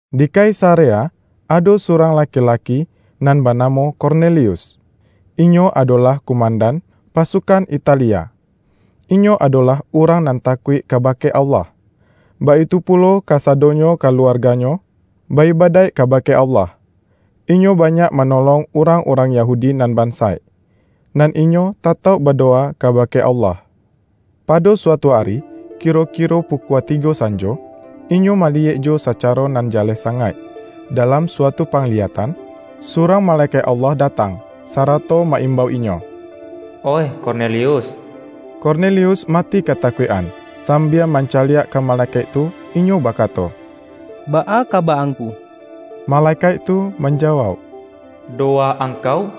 Di Kaisarea ado surang laki-laki nan banamo Kornelius. Inyo adolah kumandan”Pasukan Italia”. Inyo adolah urang nan takuik kabake Allah, baitu pulo kasadonyo kaluarganyo ba-ibadaik kabake Allah. Inyo banyak manolong urang-urang Yahudi nan bansaik, nan inyo tatauk badowa kabake Allah. Pado suatu ari kiro-kiro pukua tigo sanjo, inyo maliyek jo sacaro nan jaleh sangaik, dalam suatu pangliyatan, surang malekaik Allah datang, sarato ma-imbau inyo,”Oih Kornelius!” Kornelius mati katakuik-an, sambia mancaliak ka malekaik tu inyo bakato,”Baa kaba angku?” Malekaik tu manjawauk,”Dowa angkau,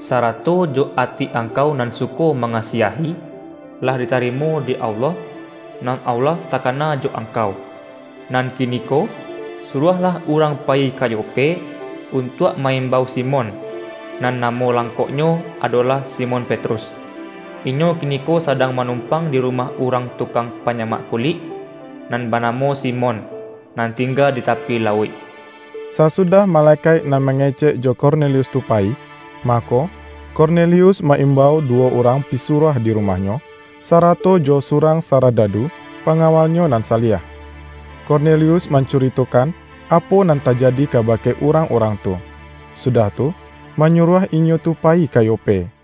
sarato jo ati angkau nan suko mangasiahi, lah ditarimo dek Allah, nan Allah takana jo angkau. Nan kiniko, suruahlah urang payi ka Yope, untuak ma-imbau Simon, nan namo langkoknyo adolah Simon Petrus. Inyo kiniko sadang manumpang di rumah urang tukang panyamak kulik, nan banamo Simon, nan tingga di tapi lauik.” Sasudah malekaik nan mangecek jo Kornelius tu, payi, mako, Kornelius ma-imbau duwo urang pisuruah di rumahnyo, sarato jo surang saradadu pangawalnyo nan saliah. Kornelius mancuritokan apo nan tajadi kabake urang-urang tu, sudah tu, manyuruah inyo tu payi ka Yope.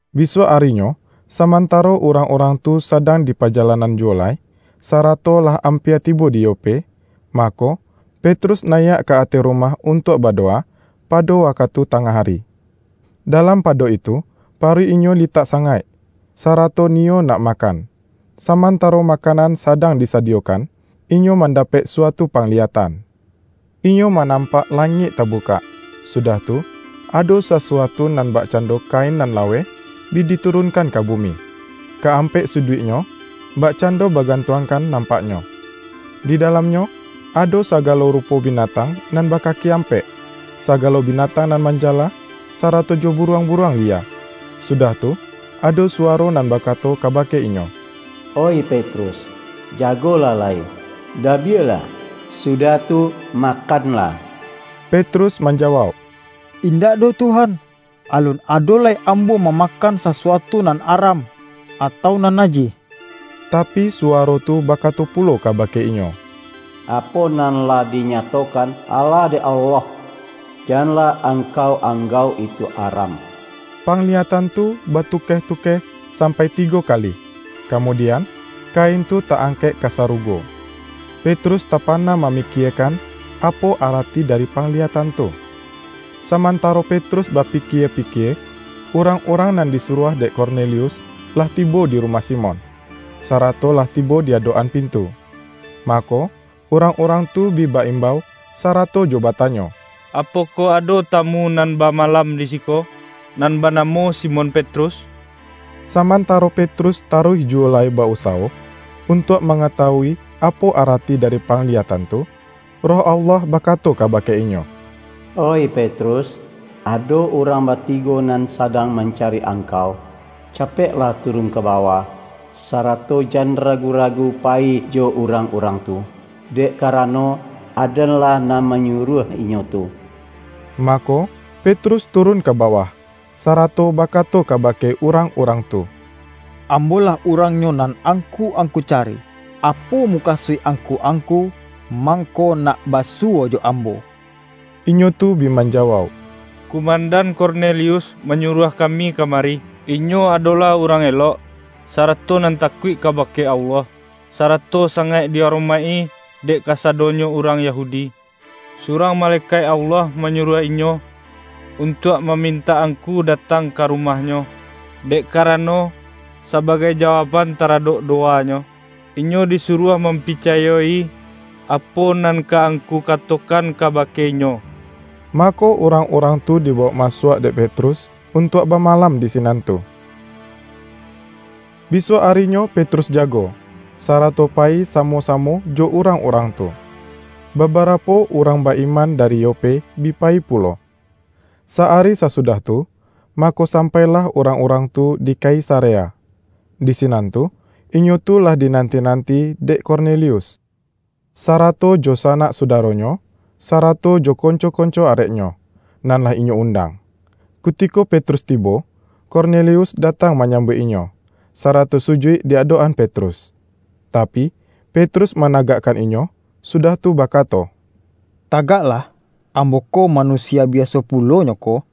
Bisuak arinyo, samantaro urang-urang tu sadang dipajalanan juwo lai, sarato lah ampia tibo di Yope, mako, Petrus nayiak ka ateh rumah untuak badowa, pado wakatu tangah ari. Dalam pado itu paruik inyo litak sangaik, sarato niyo nak makan. Samantaro makanan sadang disadiyokan, inyo mandapek suatu pangliyatan. Inyo manampak langik tabukak, sudah tu, ado sasuatu nan bakcando kain nan laweh bi diturunkan ka bumi, ka ampek suduiknyo, bakcando bagantuangkan nampaknyo. Di dalamnyo, ado sagalo rupo binatang nan bakaki ampek, sagalo binatang nan manjala, sarato jo buruang-buruang liya. Sudah tu, ado suwaro nan bakato kabake inyo,”Oih Petrus, jagolah lai! Dabiahlah, sudah tu makanlah!” Petrus manjawauk,”Indak doh Tuhan! Alun ado lai ambo mamakan sasuatu nan aram, atau nan najih.” Tapi, suwaro tu bakato pulo kabake inyo,”Apo nan lah dinyatokan ala dek Allah, janlah angkau anggauk itu aram.” Pangliyatan tu batukeh-tukeh sampai tigo kali, kamudian, kain tu ta-angkek ka sarugo. Petrus tapana mamikiekan, apo arati dari pangliyatan tu. Samantaro Petrus bapikie-pikie, urang-urang nan disuruah dek Kornelius, lah tibo di rumah Simon, sarato lah tibo di adok-an pintu. Mako, urang-urang tu bi ba-imbau, sarato jo batanyo,”Apokoh ado tamu nan bamalam di siko, nan banamo Simon Petrus?” Samantaro Petrus taruih juwo lai ba-usawo, untuak mangatawui apo arati dari pangliyatan tu, Roh Allah bakato kabake inyo,”Oih Petrus, ado urang batigo nan sadang mancari angkau. Capeklah turun ka bawah, sarato jan ragu-ragu payi jo urang-urang tu, dek karano, Aden-lah nan manyuruah inyo tu.” Mako, Petrus turun ka bawah, sarato bakato kabake urang-urang tu,”Ambo lah urangnyo nan angku-angku cari. Apo mukasuik angku-angku, mangko nak basuwo jo ambo?” Inyo tu bi manjawauk,”Kumandan Kornelius manyuruah kami kamari. Inyo adolah urang elok, sarato nan takuik kabake Allah, sarato sangaik di aromaik-i dek kasadonyo urang Yahudi. Surang malekaik Allah manyuruah inyo, untuak mamintak angku datang ka rumahnyo, dek karano, sabagai jawaukban taradok dowanyo, inyo disuruah mampicayo-i, apo nan ka angku katokan kabake inyo.” Mako, urang-urang tu dibawok masuak dek Petrus, untuak bamalam di sinan tu. Bisuak arinyo Petrus jago, sarato payi samo-samo jo urang-urang tu. Babarapo urang ba-iman dari Yope, bi payi pulo. Sa-ari sasudah tu, mako sampailah urang-urang tu di Kaisarea. Di sinan tu, inyo tu lah dinanti-nanti dek Kornelius, sarato jo sanak sudaronyo, sarato jo konco-konco areknyo, nan lah inyo undang. Kutiko Petrus tibo, Kornelius datang manyambuik inyo, sarato sujuik di adok-an Petrus. Tapi, Petrus managakkan inyo, sudah tu bakato,”Tagaklah! Ambo ko manusia biaso pulo nyo ko.”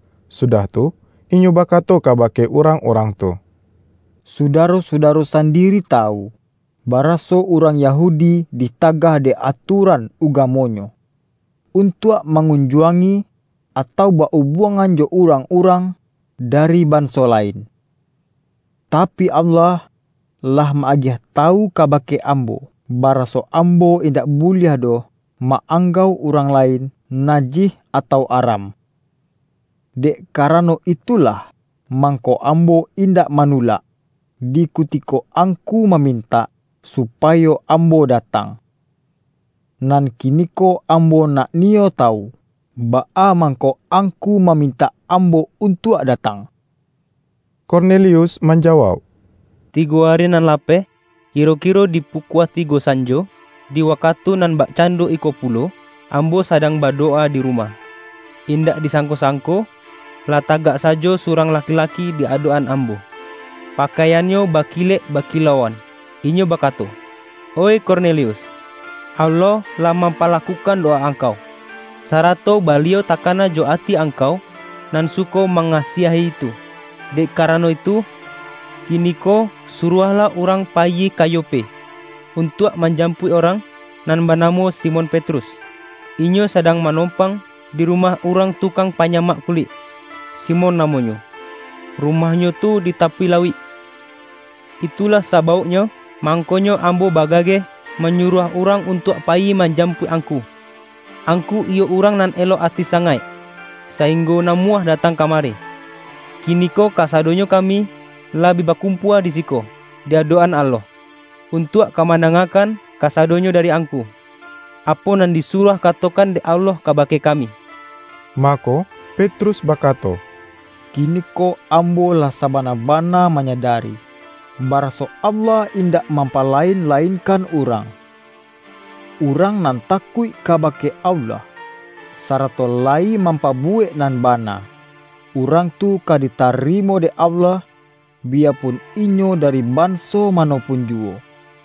Sudah tu, inyo bakato kabake urang-urang tu,”Sudaro-sudaro sandiri tawu, baraso urang Yahudi ditagah dek atuaran ugamonyo, untuak mangunjuangi, atau ba-ubuangan jo urang-urang dari banso lain. Tapi, Allah lah ma-agiah tawu kabake ambo, baraso ambo indak buliah doh ma-anggauk urang lain najih atau aram. Dek karano itulah mangko ambo indak manulak, di kutiko angku mamintak supayo ambo datang. Nan kiniko ambo nak niyo tawu, baa mangko angku mamintak ambo untuak datang.” Kornelius manjawauk,”Tigo ari nan lapeh, kiro-kiro di pukua tigo sanjo, di wakatu nan bakcando iko pulo, ambo sadang badowa di rumah. Indak disangko-sangko, lah tagak sajo surang laki-laki di adok-an ambo. Pakaiannyo bakilek bakilauan. Inyo bakato, ’Oih Kornelius! Allah lah mampalakukan dowa angkau, sarato Baliau takana jo ati angkau nan suko mangasiahi tu. Dek karano itu, kiniko suruahlah urang payi ka Yope, untuak manjapuik urang nan banamo Simon Petrus. Inyo sadang manompang di rumah urang tukang panyamak kulik, Simon namonyo; rumahnyo tu di tapi lauik.’ Itulah sabauknyo, mangkonyo ambo bagageh manyuruah urang untuak payi manjapuik angku. Angku iyo urang nan elok ati sangaik, sainggo namuah datang kamari. Kiniko kasadonyo kami lah bi bakumpua di siko di adok-an Allah, untuak ka mandangakan kasadonyo dari angku, apo nan disuruah katokan dek Allah kabake kami.” Mako, Petrus bakato,”Kiniko ambo lah sabana-bana manyadari, baraso Allah indak mampalain-lainkan urang. Urang nan takuik kabake Allah, sarato layi mampabuwek nan bana, urang tu ka ditarimo dek Allah, biyapun inyo dari banso mano pun juwo.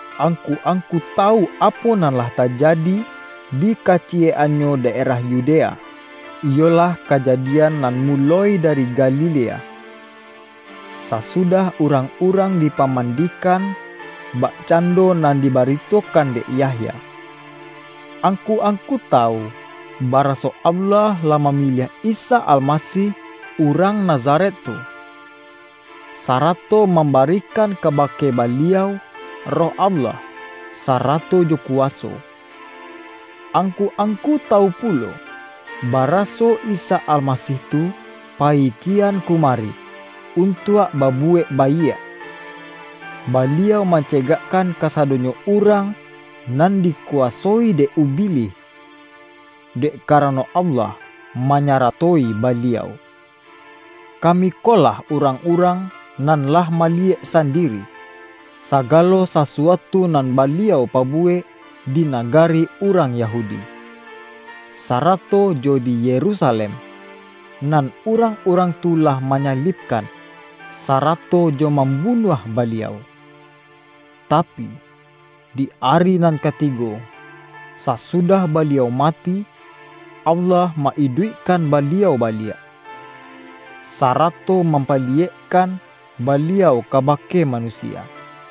Angku-angku tawu apo nan lah tajadi di kaciyek-annyo daerah Yudea, iyolah kajadian nan muloi dari Galilea, sasudah urang-urang dipamandikan bakcando nan dibaritokan dek Yahya. Angku-angku tawu, baraso Allah lah mamiliah Isa Almasih urang Nazaret tu, sarato mambarikan kabake Baliau Roh Allah, sarato jo kuwaso. Angku-angku tawu pulo, baraso Isa Almasih tu payi kian kumari untuak babuwek baiak; Baliau mancegakkan kasadonyo urang nan dikuwasoi dek Ubilih, dek karano Allah manyaratoi Baliau. Kami ko lah urang-urang nan lah maliyek sandiri, sagalo sasuatu nan Baliau pabuwek di nagari urang Yahudi, sarato jo di Yerusalem. Nan urang-urang tu lah manyalibkan, sarato jo mambunuah Baliau. Tapi, di ari nan katigo, sasudah Baliau mati, Allah ma-iduikkan Baliau baliak, sarato mampaliyek-kan Baliau kabake manusia;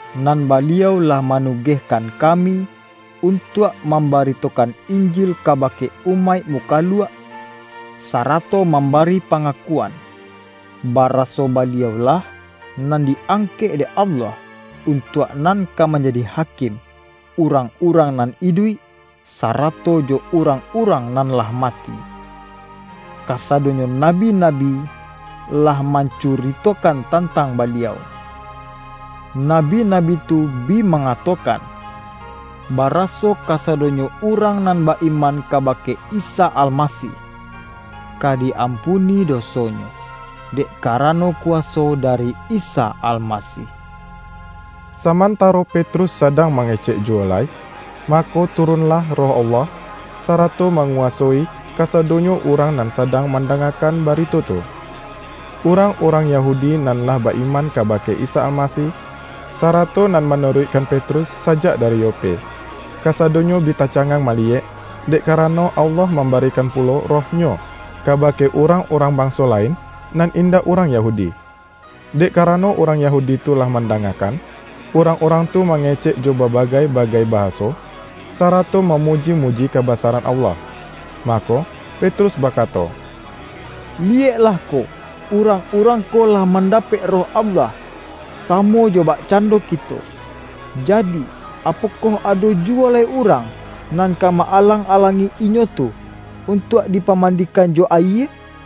Nan Baliau lah manugehkan kami untuak mambaritokan Injil kabake umaik mukaluak, sarato mambari pangakuan, baraso Baliau-lah nan di-angkek dek Allah, untuak nan ka manjadi Hakim urang-urang nan iduik, sarato jo urang-urang nan lah mati. Kasadonyo nabi-nabi lah mancuritokan tantang Baliau. Nabi-nabi tu bi mangatokan, baraso kasadonyo urang nan ba-iman kabake Isa Almasih, ka di-ampuni dosonyo, dek karano kuwaso dari Isa Almasih.” Samantaro Petrus sadang mangecek juwo lai, mako turunlah Roh Allah, sarato manguwasoi kasadonyo urang nan sadang mandangakan barito tu. Urang-urang Yahudi nan lah ba-iman kabake Isa Almasih, sarato nan manuruikkan Petrus sajak dari Yope, kasadonyo bi tacangang maliyek, dek karano Allah mambarikan pulo Roh-Nyo, kabake urang-urang banso lain nan indak urang Yahudi. Dek karano urang Yahudi tu lah mandangakan, urang-urang tu mangecek jo babagai-bagai bahaso, sarato mamuji-muji kabasaran Allah. Mako, Petrus bakato, ”Liyeklah ko, urang-urang ko lah mandapek Roh Allah samo jo bakcando kito. Jadi, apokoh ado juwo lai urang, nan ka ma-alang-alangi inyo tu, untuak dipamandikan jo ayie?”